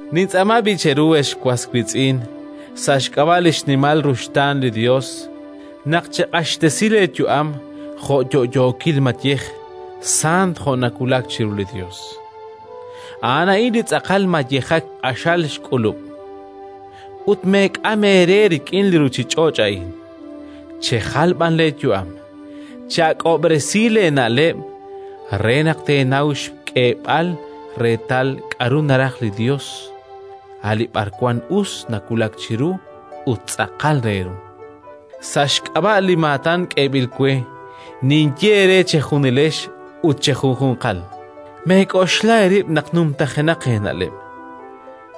Nintz'aama b'i' cheru, ex was wiitz'in, sa' xk'ab'a' li xnimal ruxtaan li Yos, naq cheq'axtesi leeyu'am jo' yo'yookil mayej, sant, jo' nawulak chiru li Yos. A'an a'in li tz'aqal mayejak q'axal xk'ulub'. Ut meek'am eere rik'in li ruuchich'och' a'in, chejal b'an leeyu'am, che'ak'ob'resi leena'leb' re naq teenaw xk'eeb'al reetal k'aru naraj li Yos: a' li b'arwan us, nawulak chiru ut tz'aqal re ru. Sa' xk'ab'a' li maatan k'eeb'il we ninye eere chejunilex ut chejunjunqal: meek'oxla eerib' naq numtajenaq eena'leb',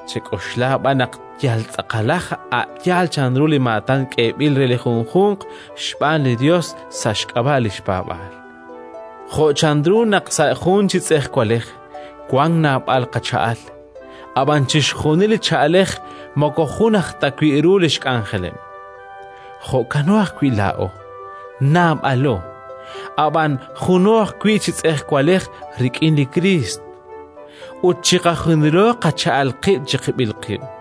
chek'oxla b'an yal tz'aqalaj, a' yaal chanru li maatan k'eeb'il re li junjunq xb'aan li Yos sa' xk'ab'a' li xpaab'aal. Jo' chanru naq sa' jun chi tz'ejwalej wank naab'al qacha'al, ab'an chixjunil li cha'alej moko jun ajtawi' ru li xk'anjeleb', jo'kano ajwi' laa'o: naab'alo, ab'an juno ajwi' chi tz'ejwalej rik'in li Kriist, ut chiqajunilo qacha'al qib' chiqib'il qib'.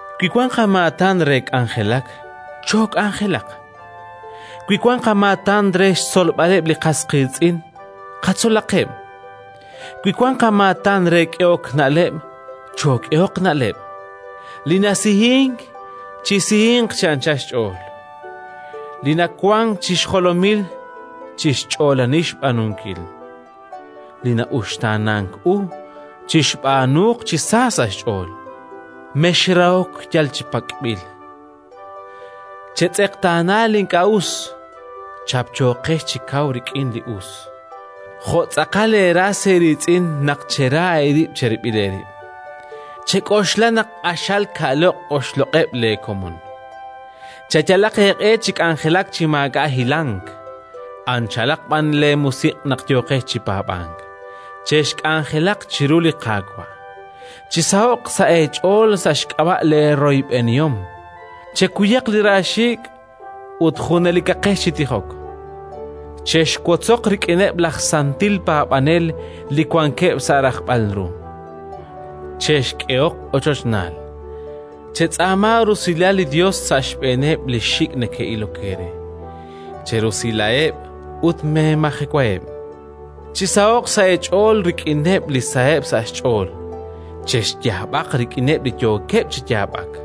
wi wank qamaatan re k'anjelak, chook'anjelaq; wi wank qamaatan re xtzolb'aleb' li qas qiitz'in, qatzolaqeb'; wi wank qamaatan re k'ehok na'leb', chook'ehoq na'leb'. Li nasihink, chisihinq chi anchal xch'ool; li nawank chi xjolomil, chixch'oolani xb'aanunkil; li na'uxtaanank u, chixb'aanuuq chi sa sa' xch'ool. Mexrahok yal chi pak'b'il, chetz'eqtaana li ink'a' us, chapchooqex chi kaw rik'in li us. Jo' tz'aqal eeras eeriitz'in naq chera eerib' cherib'il eerib'; chek'oxla naq q'axal ka'loq' oxloq'eb' leekomon. Cheyalaq eeq'e chi k'anjelak chi maak'a' hilank, anchalaq b'an leemusiq' naq yooqex chi paab'ank; chexk'anjelaq chiru li Qaawa'. Chisaho'q sa' eech'ool sa' xk'ab'a' leeroyb'enihom; chekuyaq li raaxiik' ut junelikaqex chi tijok. Chexwotzoq rik'ineb' laj santil paab'anel li wankeb' sa' rajb'al ru, chexk'ehoq ochochnaal. Chetz'aama rusilal li Yos sa' xb'eeneb' li xik' neke'ilok eere; cherusilaheb' ut meemajewaheb'. Chisaho'q sa' eech'ool rik'ineb' li saheb' sa' xch'ool, chexyaab'aq rik'ineb' li yookeb' chi yaab'ak.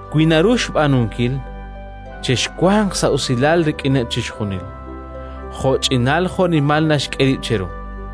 Wi naru xb'aanunkil, chexwanq sa' usilal rik'ineb' chixjunil, jo'ch'inal jo'nimal naxk'e rib' cheru.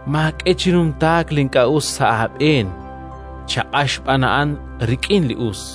Maak'e chi numtaak li ink'a' us sa' aab'een, chaq'ax b'an a'an rik'in li us.